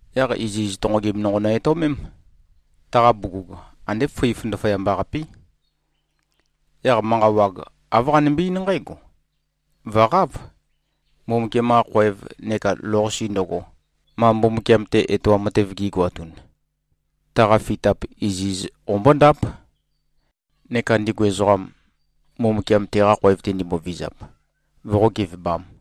Yaq iziz tonqogim nonqo nø-etøomém. Taqa bugug andé fǿif ndaføyamba-qapí. Yaq manqa wag, āv qanømbe-eín nqǽgo, “Vø̀qáv! Mbumbukiam-qa khoev neka lou-qase ndøgo, ma Mbumbukiam-te etoam matev gi꞉goatun, taqa fitap iziz qombóndáp, neka ndigu ezoqam, Mbumbukiam teqa khoev-te ndimbovizap, voqó-gevebām.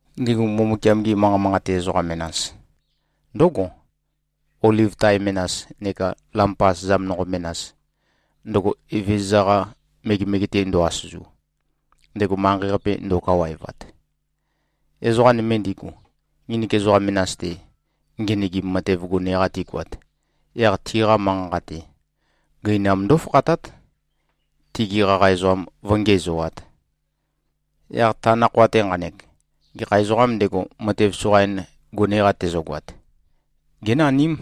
Ndigu Mbumbukiam-gi manqa manqate ezoqa menas, ndǿgo, oliv tae menas neka lampa asøzam nonqo menas, ndøgo Evezøza-qa megemege-te ndo꞉-asøzu, ndego manqei-qape ndo꞉kawaevat. Ezoqa nøme ndigu, nginik ezoqa menas-te ngenøgim matev gone-qa tigoat, yaq tiqa manqa-nqa-te, gøinam ndófakhatát, tigi qaqa ezoqam vǿngiæzoāt. Yaq ta nakhoa-te nqanek, gekha ezoqām ndego, matev soqain gone-qa tezøgoat, génaním.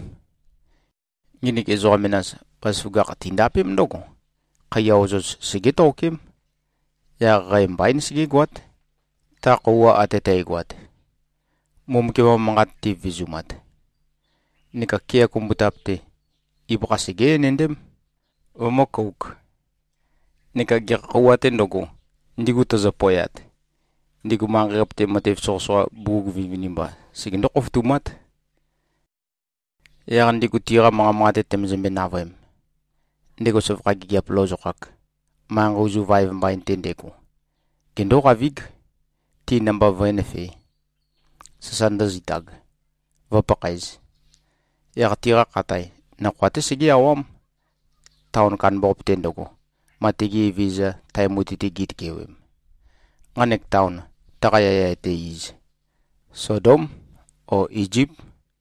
Nginik ezoqa menas, bazaføgakh tindapém ndǿgo: Khaiya ozoz segétokém. Yaq qæ mbaín, segégoát, ta khøuwa ate tægoat, Mbumbukiam-qa manqat tivevezumat. Neka kea kumbutap-te, ibøkha segé-enendém, vømǿ-kōuk. Neka gekha khøuwa-tē ndøgo, ndigu tøzø-poeat, ndigu manqei-qape-te, matev soqøsoqa bugug vinivinimba segendó-khofotumát. Yaq ndigu tiqa manqa manqate tømøzømbe-navøem, ndego søvakha gigiap lozokhak, manqei ozu vaev mbain-te ndego, gendóqavíg, ti namba vǿenøfē, sasa ndǿzitāg, vǿpakhaēz. Yaq tiqa khatae, nakhoa-té segé-awám, taon kandambaqape-te ndøgo, ma tigi Evezøza, tae mutui-te gitøkewem. Nqanek taon, taqa yaya etæ iz, Sodóm o Izíp.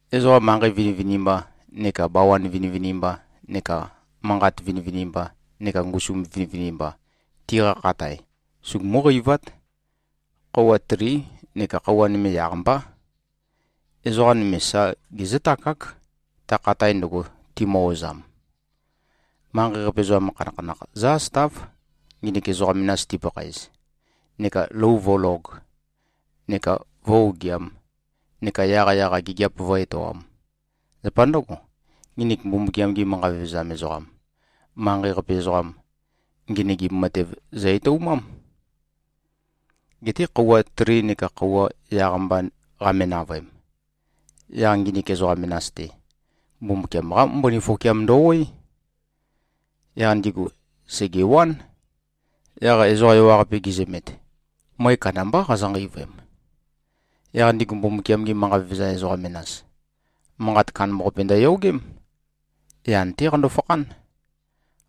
Ezoqa manqei vinivinimba, neka bawan vinivinimba neka manqat vinivinimba neka ngusu vinivinimba, tiqa khatae sugumú-qeivát. Khøuwa trí neka khøuwa nøme yaq-mbá. Ezoqa nøme sa gezǿtakák, ta khatae ndøgo, timø-ozam. Manqei-qape ezoqam khanakhanakh zǿ-asøtáv, nginik ezoqa menas tipakhaez, neka lou vǿlōg neka vǿ-ogiām neka yaqyaq-a gigiap vǿ-etoām. Zapa ndǿgo, nginik Mbumbukiam-gi manqa vevezam ezoqam, manqei-qape ezoqam, ngenøgim matev zø-etoumám. Geté khøuwa tri neka khøuwa yaq-mba qame-navøem, yaq nginik ezoqa menas-te, Mbumbukiam-qá mbøni føkiam ndø-oé. Yaq ndigu sègewán. Yaq ezoqa ewaqape, gizømet, møe kandambá qazø-nqeivøem. Yaq ndigu Mbumbukiam-gi manqa vevezam ezoqa menas, manqat kandambaqape ndøyogém. Yan-té qando-fakhán.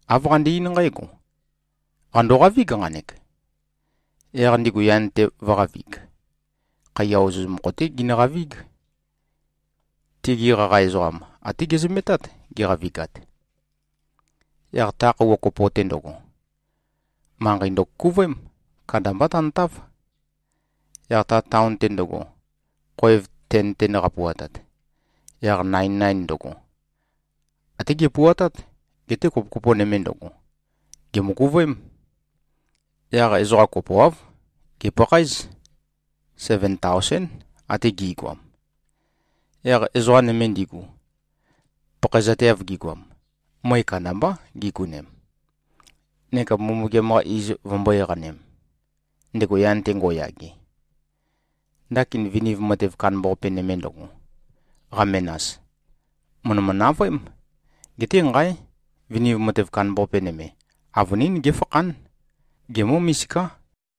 Āv qande-eín nqǽgo, “Qàndoqavíg, nqanek.” Yaq ndigu yan-te vø̄qavig. Khaiya ozoz mokho-té ginøqavíg. Tigi qaqa ezoqam, até gezømetát, giqavigat. Yaq ta khøuwa kopo-te ndøgo, manqei ndøkukuvøém. Kandambá tantáv. Yaq ta taon-te ndøgo, khoev ten-ten qapuatat, yaq nain-nain ndøgo, até gepuatát, geté kopo-kopo nøme ndøgo, gèmøkuvøém. Yaq ezoqa kopoáv, gèpakhaéz. Seven taosén, ate gi꞉goam. Yaq ezoqa nøme ndigu, pakhaezateav gigoam, møe kandambá gigonem, neka Mbumbukiam-qa iz vømbó-eqanem, ndego yan-te ngo꞉yage. Ndakin viniv matev kandambaqape nøme ndøgo, qamenas, mø̀ndømø-navøém. Geté nqáe! Viniv matev kandambaqape nøme, avønín géfakhán. Gemǿ-misiká.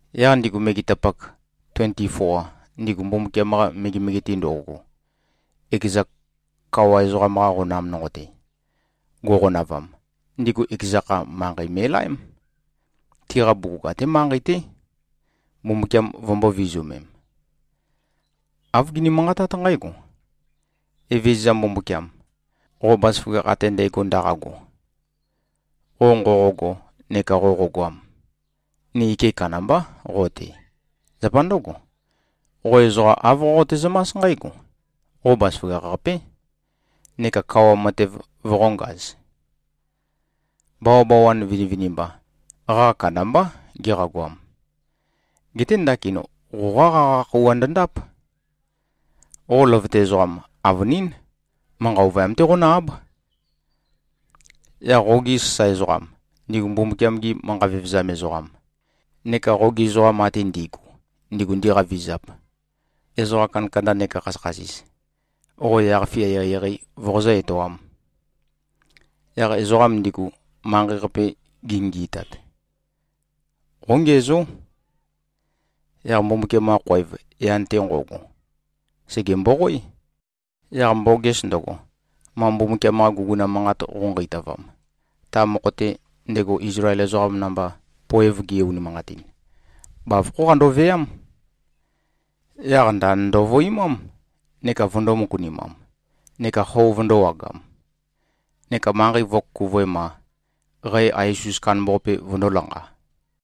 Yaq ndigu megetapak tuenti-foa, ndigu Mbumbukiam-qa megemege-te ndo꞉go, ekeza kawa ezoqam-qa qonam nonqo-te go꞉qonavam, ndigu ekeza kha, manqei me꞉laém, tiqa bugug até manqei-té, Mbumbukiam vømbō-vizumem. Āv gini-manqatát nqǽgo: “Evezøza, Mbumbukiam, qo bazaføgakh ate ndægo ndaqago, qo nqoqogo neka qoqogoam, ni ike kandambá qo-te. Zapa ndǿgo, qo ezoqa āv qoqote-zømás nqǽgo: Qo bazaføgakh-qapé, neka kawa matev voqōngaz. Bawabawan vinivinimba, qaqa kandambá giqagoam. Geté ndakin qoqá qaqa khøuwa ndøndáp. Qo løvøte ezoqam, avønín, manqa ovøyam-té qonǿ-áb. Yaq qogi sasae ezoqam, ndigu Mbumbukiam-gi manqa vevezam ezoqam, neka qogi ezoqam ate ndi꞉gu, ndigu ndiqavizap, ezoqa kandakanda neka khasøkhasis, qo yaq-fia eqeieqei voqozǿ-etoām. Yaq ezoqam ndigu, manqei-qape gingi꞉tat, qóngiæzó.” Yaq Mbumbukiam-qa khoev, yan-te nqo꞉go, sège-mboqoé. Yaq mboges ndøgo, ma Mbumbukiam-qa guguna manqat qøu-nqeitavam, ta mokho-te, ndego Izlael ezoqam namba poev ge-unimanqatin, bavokhó qandoveám. Yaq ndand ndovøimám neka vøndō-møkunimam, neka xo vøndōwagam. Neka manqei vø̄kukuvoem-a, qæ ais-us kandambaqape vøndō-lanqa.